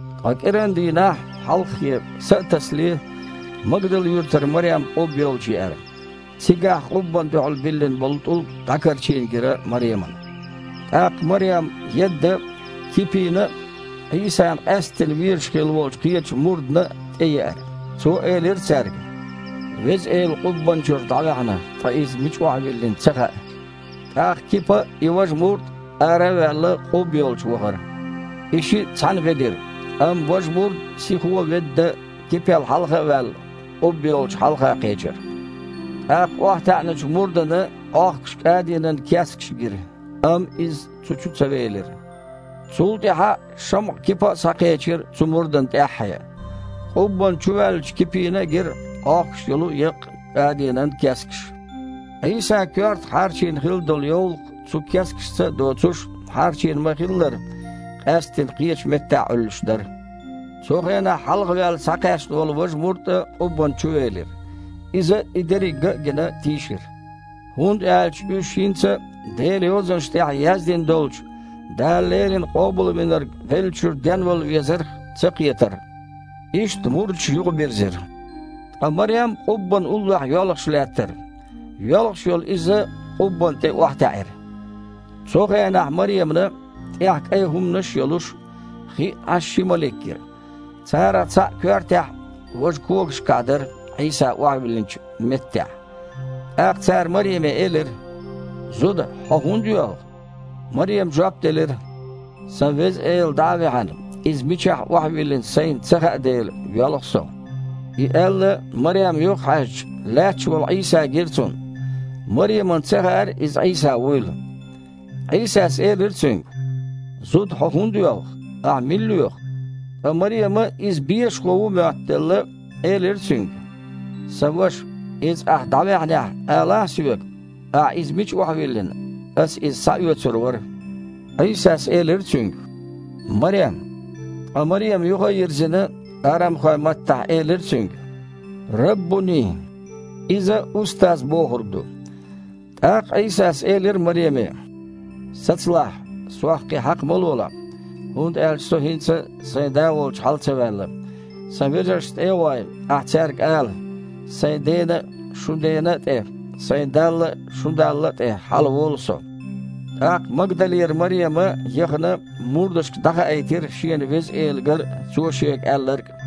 Ткъа кІирандийнахь, хьалххе, са а тасале, Магдал-юьртара Марем къубба йолчу еара. Цигахь къуббанна дуьхьал биллина болу тІулг дІакарчийна гира Маремана. ТІаккха Марем, едда, Кипина а, Іийсана къаьсттина везаш хилла волчу кхечу мурдана а тІееара. Цо элира цаьрга: «Веза Эла къуббанна чуьра дІаваьхьна, ткъа Иза мича охьавиллина ца хаьа». ТІаккха Кипа а, и важа мурд а, ара а ваьлла, къубба йолчу вахара. И шиъ цхьаьна ведира, амма важа мурд, сихо ведда, Кипел хьалха а ваьлла, къубба йолчу хьалха кхечира. ТІаккха охьатаьІначу мурдана Іохкуш кІадинан кескаш гира, амма иза цу чу ца велира. Цул тІаьхьа ШамІа-Кипа а схьакхечира цу мурдана тІаьххье. Къуббанна чуваьллачу Кипина а гира Іохкуш йолу еккъа кІадинан кескаш. Іийсан коьртах хьарчийна хилла долу йовлакх, цу кескашца а доцуш, хьарчийна ма-хиллара, къаьсттина, кхечу меттехь Іуьллуш дара. Цу хенахь хьалхаваьлла схьакхаьчна волу важа мурд а къуббанна чувелира. Иза, и дерриг ган а гина, тийшира. ХІунда аьлча уьш хІинца а Делан Йозанаш тІехь яздина долчу Дала леррина Къобалвинарг веллачуьра денвала везарх ца кхетара. Иштта мурдаш юхабирзира. Ткъа Марем къуббанна уллохь йоьлхуш лаьттара. Йоьлхуш йолу иза къуббанна тІе охьатаьІира. Цу хенахь Маремана, тІехь кІайн хІуманаш а йолуш, хиъна Іаш ши малик гира: царах цхьаъ коьртехь, важа когашкахь дара Іийса охьавиллина хиллачу меттехь. ТІаккха цара Мареме элира: «Зуда! Хьо хІунда йоьлху?» Марема жоп делира: «Сан Веза Эла дІа а ваьхьна, Иза мичахь охьавиллина сайна ца хаьа дела, йоьлху со». И аьлла, Марем юхахьаьжча, лаьтташ волу Іийса гира цунна. Маремана ца хаьара Иза Іийса вуйла. Іийсас элира цуьнга: «Зуда, хьо хІунда йоьлху? Ахьа мила лоьху?» Ткъа Марема, Иза бешахо ву моттаделла, элира Цуьнга: «Сан ваша, Иза ахьа дІаваьхьнехь, алахь соьга, ахьа Иза мича охьавиллина, аса Иза схьаоьцур вара». Іийсас элира цуьнга: «Марем!» Ткъа Марема, юха а йирзина, арамхойн маттахь элира Цуьнга: «Раббуни!» (иза «Устаз» бохург ду). ТІаккха Іийсас элира Мареме: «Сацалахь, Сох кхин хьакха ма лолахь, хІунда аьлча Со хІинца а Сайн Да волчу хьала ца ваьлла. Сан вежаршна тІе а гІой, ахьа цаьрга ала: „Сайн Дена а, шун Дена а тІе а, Сайн Далла а, шун Далла а тІе хьалаволу Со“». ТІаккха Магдалера Марема, яхана, мурдашка дІахаийтира шена Веза Эла гар а, Цо шега аьлларг а.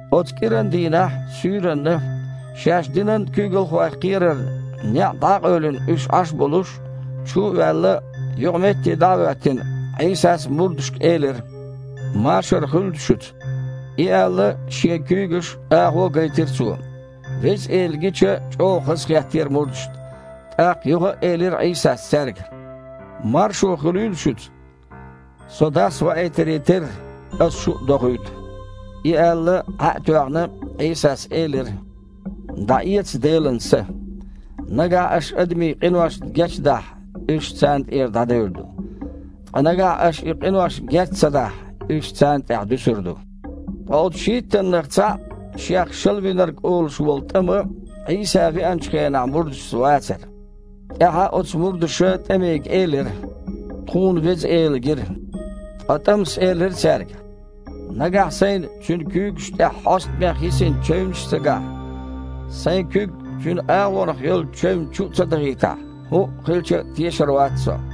Оцу кІирандийнахь, суьйранна, шаьш динан куьйгалхойх кхерарна, неІ дІакъевлина уьш Іаш болуш, чу а ваьлла, юкъаметте дІа а хІоьттина, Іийсас мурдашка элира: «Машар хуьлда шуьца!» И аьлла, Шен куьйгаш а, агІо а гайтира Цо. Веза Эла гича, чІогІа хазахеттера мурдашна. ТІаккха юха а элира Іийсас цаьрга: «Маршо хуьлийла шуьца! Со Дас ваийтаре терра, Аса шу а дохуьйту!» И аьлла, Іаь а тоьхна, Іийсас элира: «ДІаэца Делан Са. Нагахь аш адамийн къиношна гечдахь, уьш царна тІера дІадевр ду, ткъа нагахь аша и къиношна геч ца дахь, уьш царна тІехь дуьсур ду». Ткъа оцу шийттаннах цхьаъ, шех Шалавинарг олуш волу ТІама, Іийса веанчу хенахь мурдашца вацара. ТІаьхьа оцу мурдаша ТІамига элира: «Тхуна Веза Эла гира». Ткъа ТІамас элира цаьрга: «Нагахь сайна Цуьнан куьйгаш тІехь хьостамех йисина чевнаш а ца гахь, сайн куьг Цуьнан агІонах йолчу чевнна чу а ца дахийтахь, хІуъа хилча а, тешар вац со».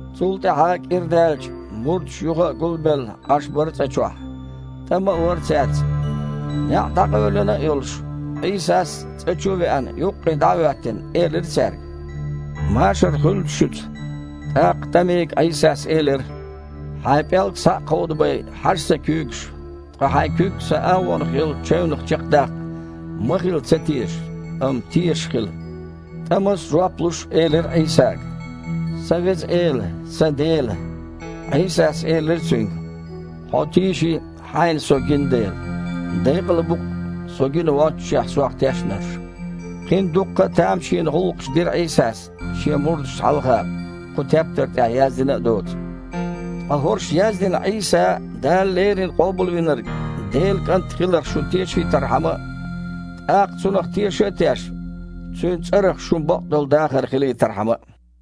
Цул тІаьхьа кІира даьлча, мурдаш юха а, гулбелла, Іаш бара цІа чохь. ТІама а вара цаьрца. НеІ дІакъевлина а йолуш, Іийсас, цІа чу а веана, юккъе дІа а хІоьттина, элира цаьрга: «Машар хуьлда шуьца!» ТІаккха ТІамига Іийсас элира: «Хьайн пІелг схьа а кховдабай, хьажа Сан куьйгашка, ткъа хьайн куьг Сан агІонах йолчу чевнах чекхдаккха. Ма хила ца тешаш, амма тешаш хила». ТІамас, жоп луш, элира Іийсага: «Сан Веза Эла, сан Дела!» Іийсас элира цуьнга: «Хьо тийши, хьайна Со гина дела. Декъала бу-кх, Со гина воццушехь, Сох тешнарш». Кхин дуккха а тамашийна гІуллакхаш дира Іийсас Шен мурдашна хьалха, кху тептар тІехь яздина а доцу. Ткъа хІорш яздина Іийса Дала леррина Къобалвинарг, Делан КІант хиларх шу тешийтархьама а, тІаккха, Цунах теша а тешна, Цуьнан цІарах шун бакъдолу дахар хилийтархьама а.